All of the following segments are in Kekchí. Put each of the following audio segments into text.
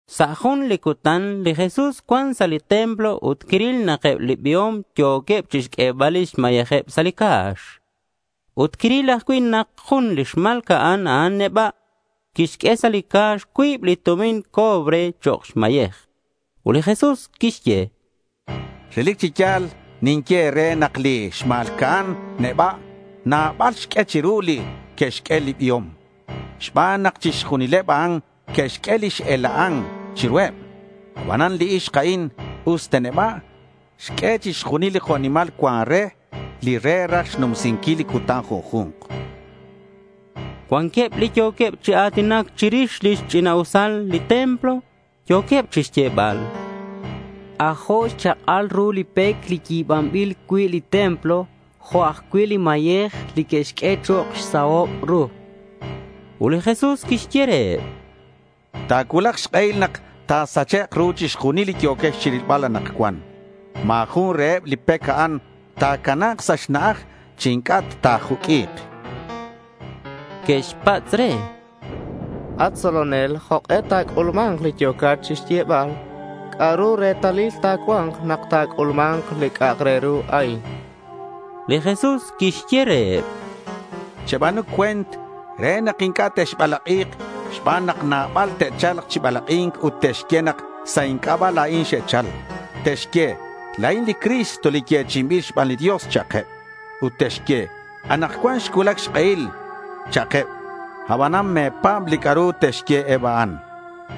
Sa' jun li cutan li Jesús cuan sa' li templo ut quiril nak eb li biom yo̱queb chixq'uebal lix mayejeb sa' li ca̱x. Ut quiril ajcui' nak jun li xma̱lca'an neba' quixq'ue sa' li ca̱x cuib li tumin cobre chok' xmayej. Ut li Jesús quixye: —Relic chi ya̱l ninye e̱re nak li xma̱lca'an neba' nabal xq'ue chiru li que'xq'ue li biom, xban nak chixjunileb a'an xe'xq'ue li x-ela'an chiruheb. Abanan li ixk a'in, usta neba', xq'ue chixjunil li jo' nimal cuan re, li re raj xnumsinquil li cutan junju̱nk. Cuanqueb li yo̱queb chi a̱tinac chirix lix ch'ina'usal li templo. Yo̱queb chixyebal: —C'ajo' xchak'al ru li pec li yi̱banbil cui' li templo jo' ajcui' li mayej li que'xq'ue chok' xsahob ru, chanqueb. Ut li Jesús quixye reheb: —Ta̱cuulak xk'ehil nak ta̱sachek' ru chixjunil li yo̱quex chirilbal anakcuan. Ma̱ jun reheb li pec a'an ta̱cana̱k sa' xna'aj chi inc'a' ta ta̱juq'ui̱k, chan li Jesús. Que'xpatz' re: —At tzolonel, ¿jok'e ta̱c'ulma̱nk li yo̱cat chixyebal? ¿C'a'ru retalil ta̱cua̱nk nak talajc'ulma̱nk li c'a'ak re ru a'in? chanqueb. Li Jesús quixye reheb: —Cheba̱nu cue̱nt re nak inc'a' texbalak'i̱k xban nak nabal te'cha̱lk chi balak'i̱nc ut te'xye nak sa' inc'aba' la̱in xe'chal. Te'xye, “La̱in li Cristo li yechi'inbil xban li Dios” cha'keb. Ut te'xye, “Anakcuan xcuulac xk'ehil.” cha'keb. Abanan me̱pa̱b li c'a'ru te'xye eb a'an.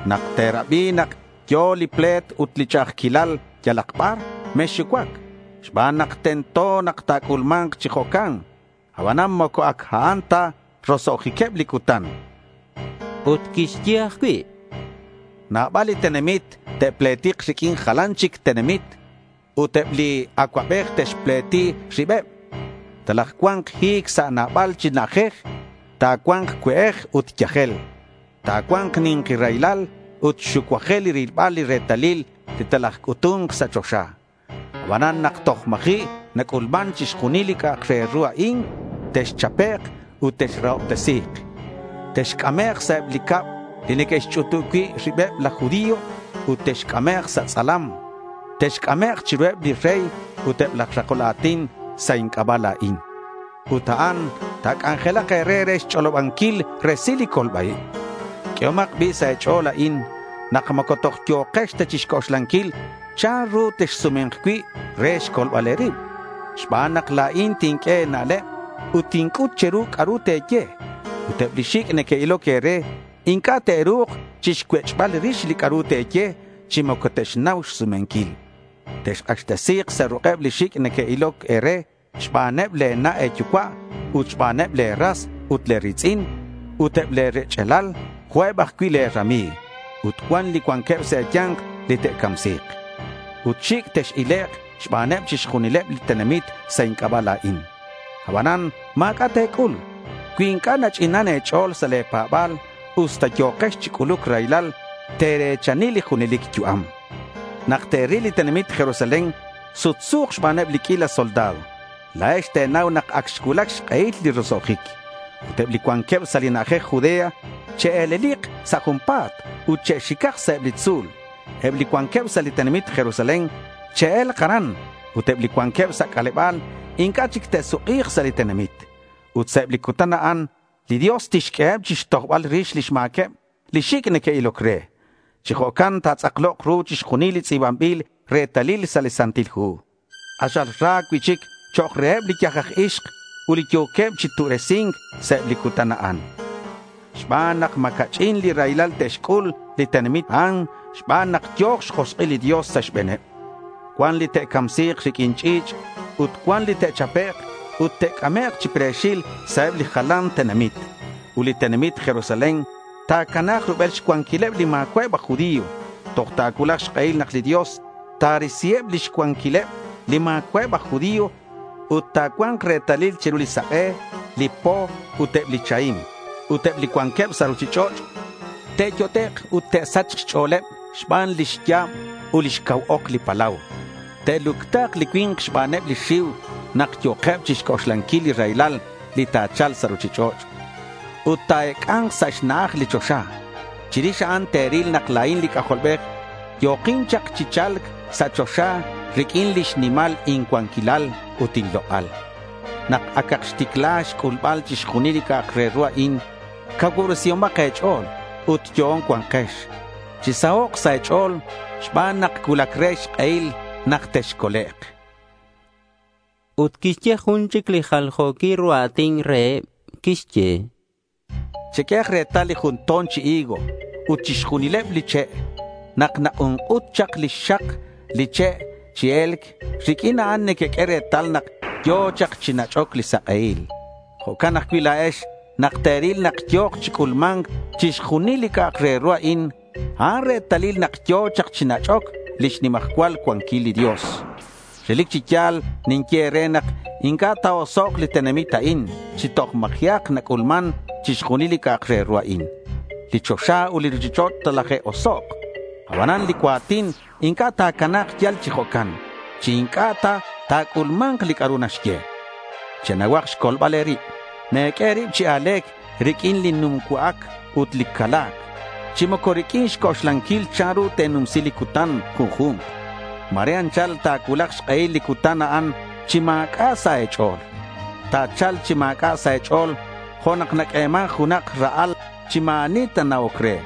Nak te̱rabi nak yo̱ li ple̱t ut li ch'a'ajquilal yalak bar, mexxucuac xban nak tento nak ta̱c'ulma̱nk chi jo'can. Abanan moco ac a'an ta roso'jiqueb li cutan, chan li Jesús. Ut quixye ajcui': —Nabal li tenamit te'pletik riq'uin jalan chic tenamit. Ut eb li acuabej te'xpleti ribeb. Talajcua̱nk hi̱c sa' nabal chi na'ajej ut ta̱cua̱nk cue'ej ut yajel. Ta̱cua̱nk ni̱nki raylal ut xucuajel rilbal li retalil li talajc'utu̱nk sa' choxa. Abanan nak toj ma̱ji' nac'ulman chixjunil li c'a'ak re ru a'in, texchapek' ut texrahobtesi̱k. Texc'amek' sa' li cab li neque'xch'utub cui' ribeb laj judío ut texc'amek' sa' tz'alam. Texc'amek' chiruheb li rey ut eb laj rakol a̱tin sa' inc'aba' la̱in. Ut a'an ta̱c'anjelak e̱re re xch'olobanquil resil li colba-ib. Q'uehomak bi' sa' e̱ch'o̱l a'in, nak moco toj yo̱kex ta chixc'oxlanquil chanru texsume̱nk cui' re xcolbal e̱rib, xban nak la̱in tinq'ue e̱na'leb ut tinc'ut che̱ru c'a'ru te̱ye. Ut eb li xic' neque'iloc e̱re inc'a' te'ru̱k chixcuech'bal rix li c'a'ru te̱ye, chi moco te'xnau xsumenquil. Texk'axtesi̱k sa' ruk'eb li xic' neque'iloc e̱re xbaneb le̱ na' e̱yucua' ut xbaneb le̱ ras ut le̱ ri̱tz'in ut eb le̱ rech'alal jo' eb ajcui' le̱ rami̱g. Ut cuan li cuanqueb sa' e̱ya̱nk li te'camsi̱k. Ut xic' tex-ilek' xbaneb chixjunileb li tenamit sa' inc'aba' la̱in. Abanan ma̱c'a' te̱c'ul. Cui inc'a' nach'inan e̱ch'o̱l sa' le̱ pa̱ba̱l usta yo̱kex chi c'uluc raylal te̱re̱chani li junelic yu'am. Nak te̱ril li tenamit Jerusalén sutsu̱k xbaneb li q'uila soldado, la̱ex te̱nau nak ac xcuulac xk'ehil li roso'jic. Ut eb li cuanqueb sa' li na'ajej Judea che'e̱lelik sa' junpa̱t ut che'xicak sa' eb li tzu̱l. Eb li cuanqueb sa' li tenamit Jerusalén che'e̱lk aran ut eb li cuanqueb sa' c'aleba̱l inc'a' chic te'suk'i̱k sa' li tenamit. Ut sa' eb li cutan a'an, li Dios tixq'ueheb chixtojbal rix lix ma̱queb li xic' neque'iloc re. Chi jo'can ta̱tz'aklok ru chixjunil li tz'i̱banbil retalil sa' li Santil Hu. K'axal ra cui'chic chok' reheb li yaj aj ixk ut li yo̱queb chi tu'resi̱nk sa' eb li cutan a'an, xban nak ma̱ ca'ch'in li raylal te'xc'ul li tenamit a'an xban nak yo̱k xjosk'il li Dios sa' xbe̱neb. Cuan li te'camsi̱k riq'uin ch'i̱ch' ut cuan li te'chapek' ut te'c'amek' chi pre̱xil sa' eb li jalan tenamit. Ut li tenamit Jerusalén ta̱cana̱k rubel xcuanquileb li ma̱cua'eb aj judío toj ta̱cuulak xk'ehil nak li Dios ta̱risiheb lix cuanquileb li ma̱cua'eb aj judío, chan li Jesús. Ut ta̱cua̱nk retalil chiru li sak'e, li po ut eb li chahim. Ut eb li cuanqueb sa' ruchich'och' te'yot'ek' ut te'sach xch'o̱leb xban lix ya̱b ut lix cau ok li palau. Te'lucta̱k li cui̱nk xbaneb xxiu nak yo̱keb chixc'oxlanquil li raylal li ta̱cha̱lk sa' ruchich'och'. Ut ta̱ec'a̱nk sa' xna'aj li choxa. Chirix a'an te̱ril nak la̱in li C'ajolbej yo̱kin chak chi cha̱lc sa' choxa riq'uin lix nimal incuanquilal ut inlok'al. Nak acak xticla xc'ulbal chixjunil li c'a'ak re ru a'in, cacuubresihomak e̱ch'o̱l ut yo'on cua̱nkex. Chisahok' sa' e̱ch'o̱l xban nak cuulac re xk'ehil nak texcolek', chan li Jesús. Ut quixye jun chic li jaljo̱quil ru a̱tin reheb. Quixye: Cheq'uehak retal li jun to̱n chi higo ut chixjunileb li che'. Nak nak'unk'ut chak lix xak li che' chi e̱lc, riq'uin a'an nequeq'ue retal nak yo̱ chak chi nach'oc li sak'ehil. Jo'can ajcui' la̱ex nak te̱ril nak yo̱k chi c'ulma̱nc chixjunil li c'a'ak re ru a'in, a'an retalil nak yo̱ chak chi nach'oc lix nimajcual cuanquil li Dios. Relic chi ya̱l ninye e̱re nak inc'a' ta̱osok' li tenamit a'in chi toj ma̱ji'ak nac'ulman chixjunil li c'a'ak re ru a'in. Li choxa ut li ruchich'och' talaje'osok'. Abanan li cua̱tin inc'a' ta̱cana̱k yal chi jo'can chi inc'a' ta ta̱c'ulma̱nk li c'a'ru naxye. Chenauhak xcolbal e̱rib. Me̱q'ue e̱rib chi a̱le̱c riq'uin li numcua'ac ut li cala̱c, chi moco riq'uin xc'oxlanquil chanru te̱numsi li cutan junju̱nk. Ma̱re anchal ta̱cuulak xk'ehil li cutan a'an chi ma̱c'a' sa' e̱ch'o̱l. Ta̱cha̱lk chi ma̱c'a' sa' e̱ch'o̱l jo' nak naq'ueman junak ra'al chi ma̱ ani nana'oc re.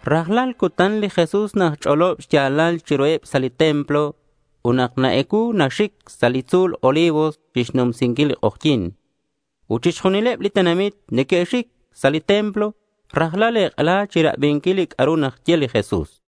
Rajlal cutan li Jesús naxch'olob xya̱lal chiruheb sa' li templo ut nak na-ecuu, naxic sa' li tzu̱l Olivos chixnumsinquil li k'ojyi̱n. Ut chixjunileb li tenamit neque'xxic sa' li templo rajlal ek'ela chirabinquil li c'a'ru naxye li Jesús.